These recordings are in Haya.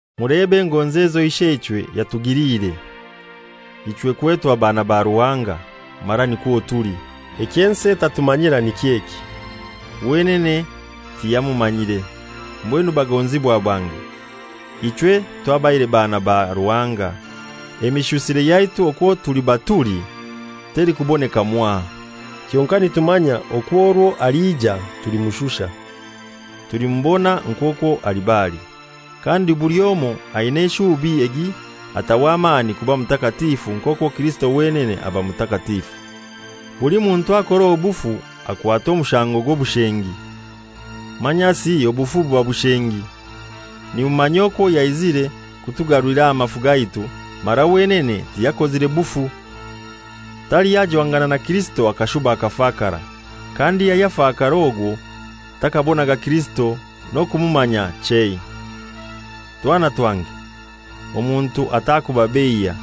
Mulebe engonzi ezo Isheichwe yatugiliire, ichwe kwetwa baana ba Ruhanga, mara nikwo tuli. Ekyo ensi etatumanyira niky'eki: Wenene tiyamumanyire. Mbwenu bagonzibwa bange, ichwe twabaire baana ba Ruhanga. Emishusire yaitu okwo tuliba tuli telikuboneka mwaha, kyonkai nitumanya okwo orwo aliija tulimushusha. Tulimubona nk'okwo aliba ali. Kandi buli omoi aina eshuubi egi ataho amaani kuba mutakatifu nk'okwo Kirisito wenene aba mutakatifu. Buli muntu akora obufu akwatwa omushango gw'obushengi; manyasi obufu buba bushengi. Nimumanya okwo yaizire kutugarulira amafu gaitu, mara wenene tiyakozire bufu. Taliho ajwangana na Kirisito akashuba akafakara. Kandi ayafakara ogwo takaabonaga Kirisito, n'okumumanya chei. Twana twange, omuntu atakubabeiya.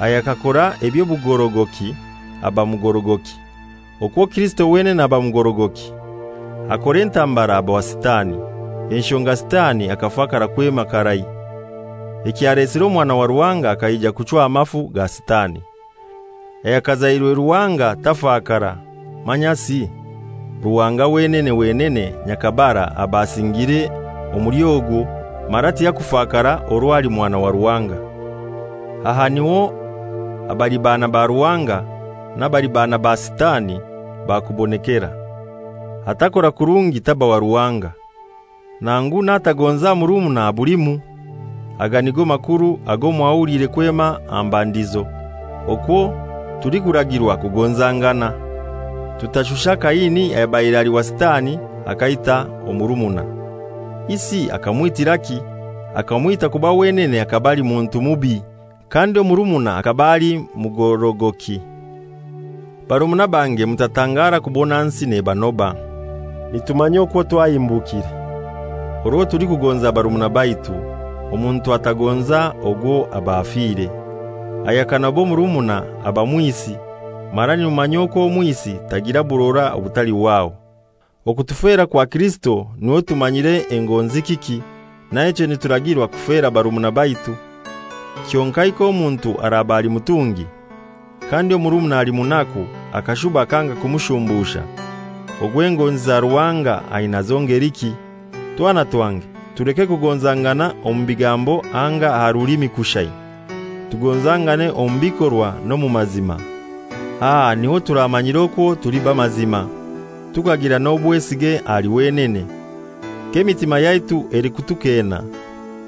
Ayakakora eby'obugorogoki aba mugorogoki, okwo Kirisito wenene aba mugorogoki. Akora entambara aba wa Sitani, enshonga Sitani akafakara kwema karai. Ekyalesire Omwana wa Ruhanga akaija kuchwa amafu ga Sitani. Ayakazairwe Ruhanga tafakara, manyasi Ruhanga wenene wenene nyakabara aba asingiire omuli ogwo, mara tiyakufakara orwo ali Mwana wa Ruhanga. Aha niho abali baana ba Ruhanga n'abali baana ba Sitani bakubonekera. Atakora kurungi taba wa Ruhanga, nangu n'atagonza murumuna abulimu. Aga nigo makuru ago mwahuliire kwema aha mbandizo, okwo tulikuragirwa kugonzangana, tutashusha Kaini ayabaire ali wa Sitani akaita omurumuna. Isi akamwitiraki? Akamwita kuba wenene akaba ali muntu mubi, kandi omurumuna akaba ali mugorogoki. Barumuna bange mutatangara kubona nsi nebanoba. Nitumanya okwo twahimbukire, orwo tulikugonza barumuna baitu. Omuntu atagonza ogwo aba afire. Ayakanoba omurumuna aba mwisi, mara nimumanya okwo omwisi tagira burora obutalihwaho. Okutufera kwa Kirisito niho tumanyira engonzi kiki. Naichwe nituragirwa kufera barumuna baitu. Kyonkai k'omuntu araba ali mutungi, kandi omurumuna ali munaku akashuba akanga kumushumbusha, ogwo engonzi za Ruhanga ainazo ngeliki? Twana twange, tuleke kugonzangana omu bigambo anga aha rulimi kushai. Tugonzangane omu bikorwa n'omu mazima. Aha niho turamanyira okwo tuli b'amazima, tukagira n'obwesige ahali wenene. K'emitima yaitu elikutukeena,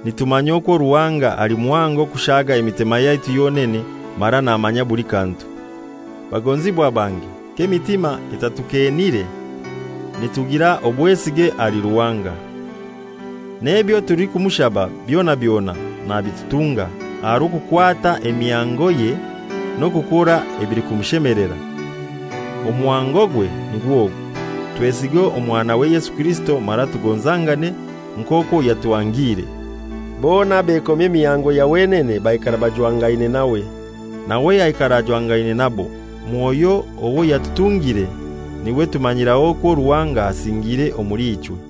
nitumanya okwo Ruhanga ali muhango kushaaga emitima yaitu yonene mara namanya buli kantu. Bagonzibwa bange k'emitima etatukeenire, nitugira obwesige ahali Ruhanga, n'ebyo tulikumushaba byona byona nabitutunga, aha rw'okukwata emihangoye n'okukora ebilikumushemelera. Omuhangogwe nigw'ogu: Twesige Omwanawe Yesu Kirisito mara tugonzangane, nk'okwo yatuhangre. Bona abekomya emihango ya wenene baikara bajwangaine nawe, nawe aikara ajwangaine nabo. Mwoyo owo yatutungire niwe tumanyiraho okwo Ruhanga asingiire omuli ichwe.